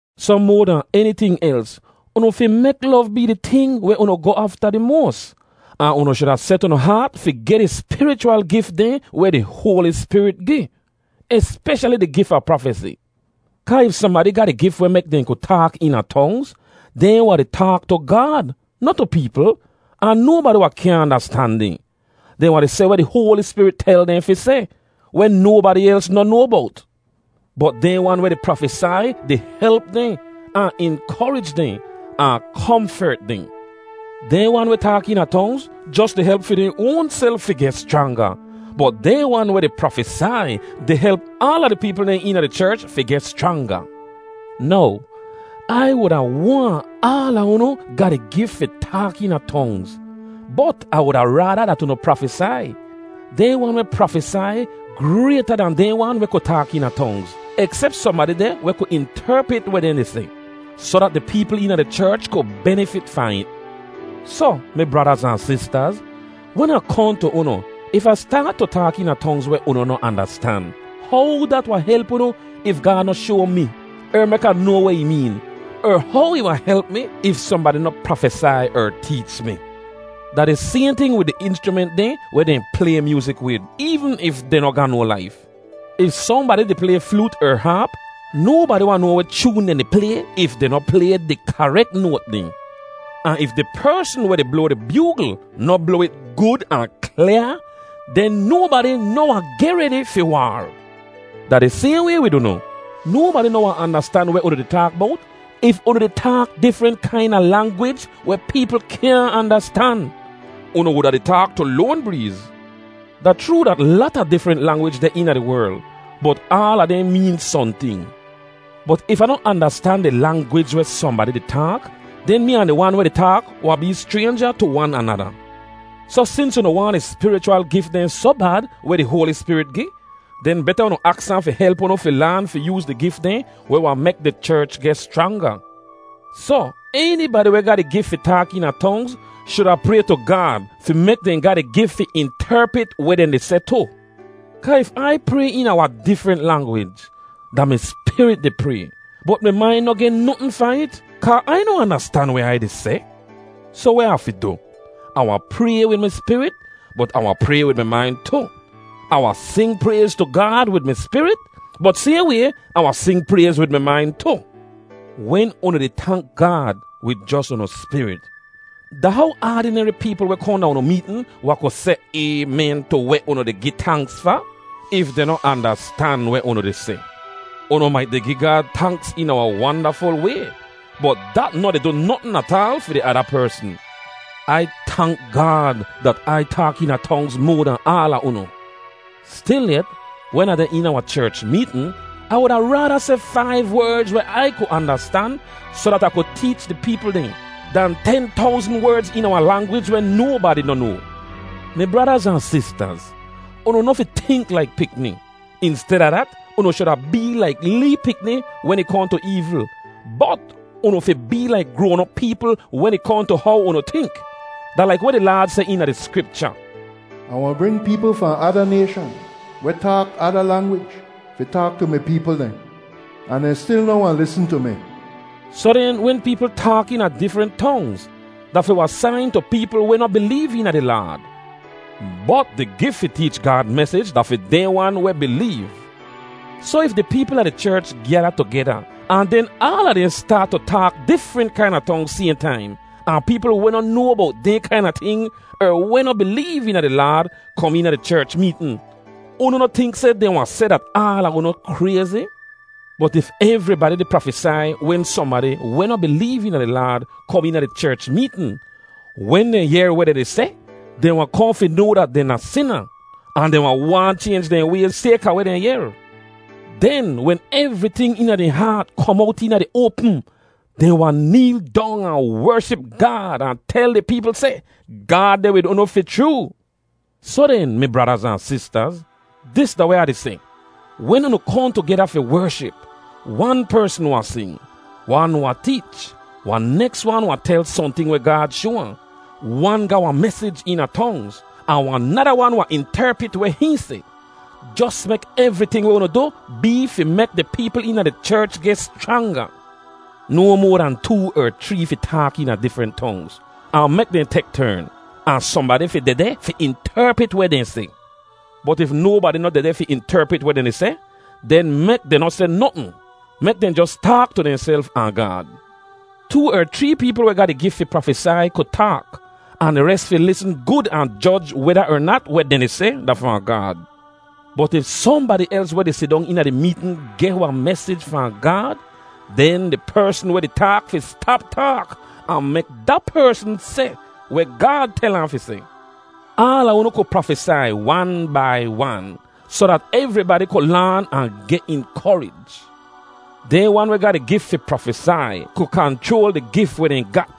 Soh moa dahn eniting els, unu fi mek lov bee di ting weh unu goh afta di moas. Ahn unu shuda set unu haat fi geh di spirichwal gif dehn weh di Hoali Spirit gi, espeshali di gif a prafesi. Kaa if sohnbadi ga di gif weh mek dehn ku taak eena tongz, dehn wahn di taak tu Gaad, noh tu peepl; ahn nobadi wahn kyaahn andastan dehn. Dehn wahn di seh weh di Hoali Spirit tel dehn fi seh, weh nobadi els noh noa bowt. Bot dehn wan weh di prafesai di help dehn, ahn inkorij dehn, ahn komfert dehn. Dehn wan weh taak eena tongz, jos di help fi dehn oanself fi geh schranga, bot dehn wan weh di prafesai di help aala di peepl dehn eena di cherch fi geh schranga. Now, Ai wuda waahn aala unu ga di gif fi taak eena tongz, bot Ah wuda raada dat unu prafesai. Dehn wan weh prafesai grayta dan dehn wan weh ku taak eena tongz, eksep sohnbadi deh weh ku interpit weh dehn di seh, soh dat di peepl eena di cherch ku benifit fahn it. Soh, mi bradaz ahn sistaz, wen Ah kohn tu unu, if Ah staat tu taak eena tongz weh unu noh andastan, how dat wahn help unu if Gaad noh shoa mi er mek Ah noa weh ih meen, er how ih wahn help mi if sohnbadi noh prafesai er teech mi? Da di sayhn ting wid di inschrument dehn weh dehn play myoozik wid, eevn if dehn noh ga no laif: If sohnbadi di play floot er haap, nobadi wahn noa weh choon dehn di play if dehn noh di play di karek noat dehn. Ahn if di persn weh di bloa di byoogl noh bloa it gud ahn klyaa, den nobadi noh wahn geh redi fi waar. Da di sayhn way wid unu. Nobadi noh wahn andastan weh unu di taak bowt if unu di taak difrent kaina langwij weh peepl kyaahn andastan. Unu wuda di taak tu loan breez. Da chroo dat lata difrent langwij deh eena di werl, bot aala dehn meen sohnting. Bot if Ah noh andastan di langwij weh sohnbadi di taak, den mee ahn di wan weh di taak wahn bee schraynja tu wan anada. Soh sins unu waahn di spirichwal gif dehn soh bad weh di Hoali Spirit gi, den beta unu aks ahn fi help unu fi laan fi yooz di gif dehn weh wahn mek di cherch geh schranga. Soh, enibadi weh ga di gif fi taak eena tongz shuda pray tu Gaad fi mek dehn ga di gif fi interpit weh dehn di seh tu. Kaa if Ai pray eena wahn difrent langwij, da mi spirit di pray, bot mi main noh geh notn fahn it, kaa Ai noh andastan weh Ai di seh. Soh weh Ah fi du? Ah wahn pray wid mi spirit, bot Ah wahn pray wid mi main tu. Ah wahn sing prayz tu Gaad wid mi spirit, bot sayhn way, Ah wahn sing prayz wid mi main tu. Wen unu di tank Gaad wid jos unu spirit, da how aadineri peepl weh kohn da unu meetn wahn ku seh “Aymen” tu weh unu di gi tanks fa, if dehn noh andastan weh unu di seh? Unu mait di gi Gaad tanks eena wahn wandaful way, bot dat noh di du notn ataal fi di ada persn. Ai tank Gaad dat Ai taak eena tongz moa dahn aala unu. Stilyet, wen Ah deh eena wahn cherch meetn, Ah wuda raada seh faiv werdz weh Ai ku andastan soh dat Ah ku teech di peepl dehn, dan ten towzn werdz eena wahn langwij weh nobadi noh noa. Mi bradaz ahn sistaz, unu noh fi tink laik pikni. Insteda dat, unu shuda bee laik lee pikni wen ih kohn tu eevl, bot unu fi bee laik groan-op peepl wen ih kohn tu how unu tink. Da laik weh di Laad seh eena di Skripcha, “Ah wahn bring peepl fahn ada nayshan, weh taak ada langwij, fi taak tu mi peepl dehn. Ahn dehn stil noh wahn lisn tu mi.” Soh den, wen peepl taak eena difrent tongz, da fi wahn sain tu peepl weh noh bileev eena di Laad; bot di gif fi teech Gaad mesij da fi dehn wan weh bileev. Soh if di peepl a di cherch gyada tugeda ahn den aala dehn staat tu taak difrent kaina tongz sayhn taim, ahn peepl weh noh noa bowt dehn kaina ting er weh noh bileev eena di Laad kom eena di cherch meetn, unu noh tink seh dehn wahn seh dat aala unu krayzi? Bot if evribadi di prafesai wen sohnbadi weh noh bileev eena di Laad kom eena di cherch meetn, wen dehn yehr weh dehn di seh, dehn wahn kohn fi noa dat dehn da sina, ahn dehn wahn waahn chaynj dehn wayz sayka weh dehn yehr. Den wen evriting eena dehn haat kom owt eena di oapm, dehn wahn neel dong ahn wership Gaad ahn tel di peepl seh, “Gaad deh wid unu fi chroo!” Soh den, mi bradaz ahn sistaz, dis da weh Ah di seh: Wen unu kohn tugeda fi wership, wan persn wahn sing, wan wahn teech, wahn neks wan wahn tel sohnting weh Gaad shoa ahn, wan ga wahn mesij eena tongz, ahn wahn nada wan wahn interpit weh hihn seh. Jos mek evriting weh unu du bee fi mek di peepl eena di cherch geh schranga. No moa dan too er chree fi taak eena difrent tongz; ahn mek dehn tek tern. Ahn sohnbadi fi dehdeh fi interpit weh dehn seh. Bot if nobadi noh dehdeh fi interpit weh dehn di seh, den mek dehn noh seh notn. Mek dehn jos taak tu dehnself ahn Gaad. Too er chree peepl weh ga di gif fi prafesai ku taak, ahn di res fi lisn gud ahn joj weda er nat weh dehn di seh da fahn Gaad. Bot if sohnbadi els weh di sidong eena di meetn geh wahn mesij fahn Gaad, den di persn weh di taak fi stap taak ahn mek da persn seh weh Gaad tel ahn fi seh. Aala unu ku prafesai wan bai wan, soh dat evribadi ku laan ahn geh inkorij. Dehn wan weh ga di gif fi prafesai ku kanchroal di gif weh dehn gat.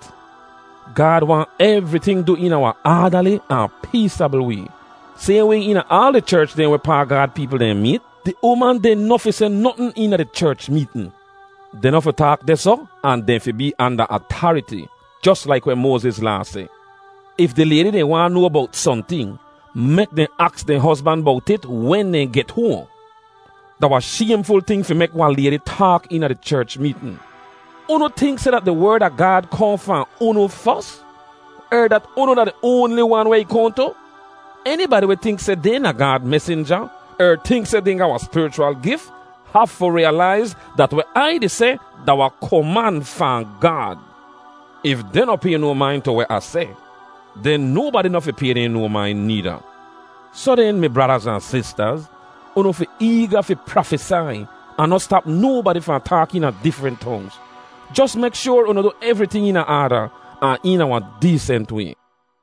Gaad waahn evriting du eena wahn aadali ahn peesabl way. Sayhn way eena aal di cherch dehn wehpaa Gaad peepl dehn meet, di uman dehn noh fi seh notn eena di cherch meetn. Dehn noh fi taak dehsoh ahn dehn fi bee anda atariti, jos laik weh Moaziz Laa seh. If di laydi dehn waahn noa bowt sohnting, mek dehn aks dehn hozban bowt it wen dehn get hoahn. Da wahn shaymful ting fi mek wahn laydi taak eena di cherch meetn. Unu tink seh dat di Werd a Gaad kohn fahn unu fos, er dat unu da di oanli wan weh ih kohn tu? Enibadi weh tink seh dehn da Gaad mesinja er tink seh dehn ga wahn spirichwal gif hafu riyalaiz dat weh Ai di seh da wahn koman fahn Gaad. If dehn noh pay no main tu weh Ah seh, den nobadi noh fi pay dehn no main needa. Soh den, mi bradaz ahn sistaz, unu fi eega fi prafesai, ahn noh stap nobadi fahn taak eena difrent tongz. Jos mek shoar unu du evriting eena aada, ahn eena wahn deesent way.